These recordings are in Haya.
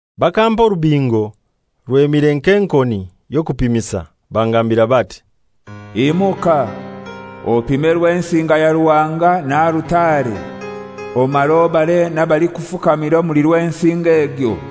Bakampa orubingo rwemire nk'enkoni y'okupimisa, bangambira bati, «Imuka, opime Rwensinga ya Ruhanga na alutare, omare obare n'abalikufukamira omuli Rwensinga egyo.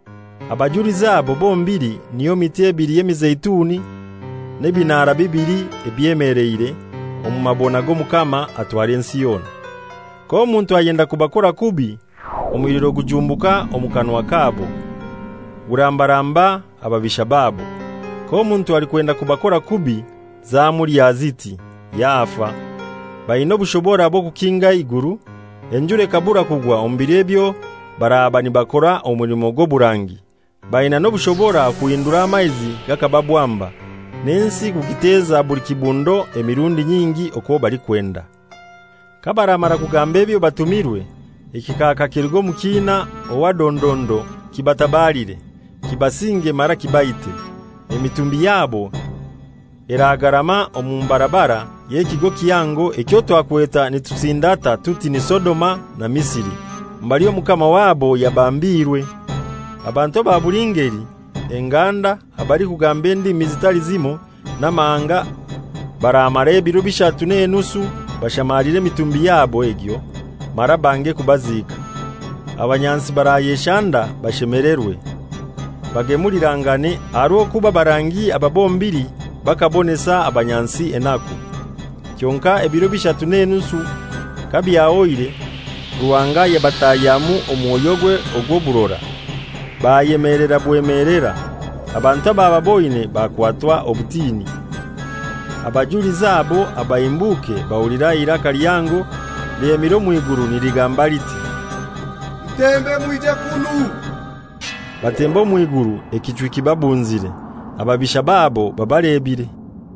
Abajulizi abo bombili niyo miti ebili y'emizeituni n'ebinaara bibili ebyemeleire omu mabona g'Omukama atwara ensi yona. K'omuntu ayenda kubakora kubi, omuliro gujumbuka omu kanwa kabo, gurambaramba ababisha babo. K'omuntu alikwenda kubakora kubi, zamulya ziti! Yafa! Bainai obushobora bw'okukinga eiguru, enjura ekabura kugwa omu biro ebyo baraba nibakora omulimo gw'oburangi. Baina n'obushobora okuhindura amaizi gakaba bwamba, n'ensi kugiteza buli kibundo emirundi nyingi okwo balikwenda. Kabaramara kugamba ebyo batumirwe, ekikaaka kiruge omu kiina owa dondondo kibatabalire, kibasinge mara kibaite. Emitumbi yabo eragangarama omu mbarabara y'ekigo kihango ekyo twakweta nitusindata tuti ni Sodoma na Misiri, mbali Omukama wabo yabambiirwe. Abantu aba buli ngeli, enganda, abalikugamba endimi zitali zimoi, n'amahanga baramara ebiro bishatu n'enusu bashamaliire emitumbi yabo egyo mara bange kubaziika. Abanyansi barayeshanda bashemelerwe, bagemulirangane, aha rw'okuba abarangi aba bombili bakabonesa abanyansi enaku. Kyonkai ebiro bishatu n'enusu kabyahoire Ruhanga yabatahyamu omwoyogwe ogw'oburora, bayemelera bwemelera, abantu abababoine bakwatwa obutini. Abajulizi abo abahimbuke bahulira eiraka lihango lyemire omw'iguru niligamba liti, «Mutembe mwije kunu!» Batemba omw'iguru ekichwi kibabunzire, ababisha babo babalebire.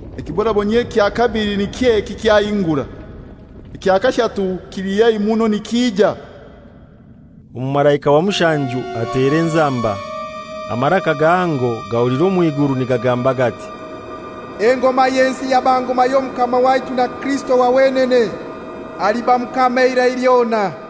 Ekibonabonyio ekya kabili niky'eki kyahingura. Ekya kashatu kili haihi muno nikija. Omumalaika wa mushanju atera enzamba. Amaraka gahango gahulirwa omw'iguru nigagamba gati, «Engoma y'ensi yaba ngoma y'Omukama waitu na Kirisito wa wenene, aliba Mukama eirai lyona.»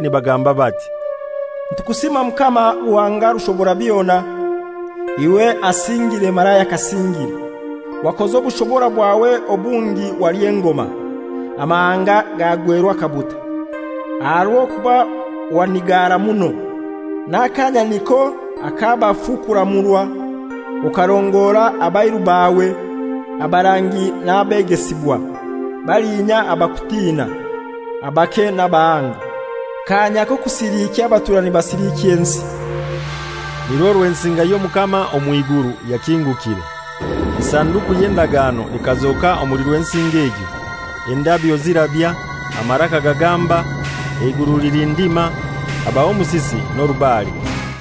nibagamba bati, «Nitukusiima Mukama Ruhanga Rushoborabyona, iwe asingire mara ayakasingire, wakoza obushobora bwawe obungi waly'engoma. Amahanga gagwerwa akabuta, aha rw'okuba wanigara muno, n'akanya niko ak'abafu kuramurwa, okarongora abairu bawe, abarangi n'abegesibwa, balinya abakutina, abake n'abahango. Kaanya k'okusilikya abatura nibasilikya ensi.» Nirwo Rwensinga y'Omukama omw'iguru yakingukire, Esanduku y'Endagano ekazoka omuli Rwensinga egyo. Endabyo zirabya, amaraka gagamba, eiguru lilindima, habaho omusisi n'orubare.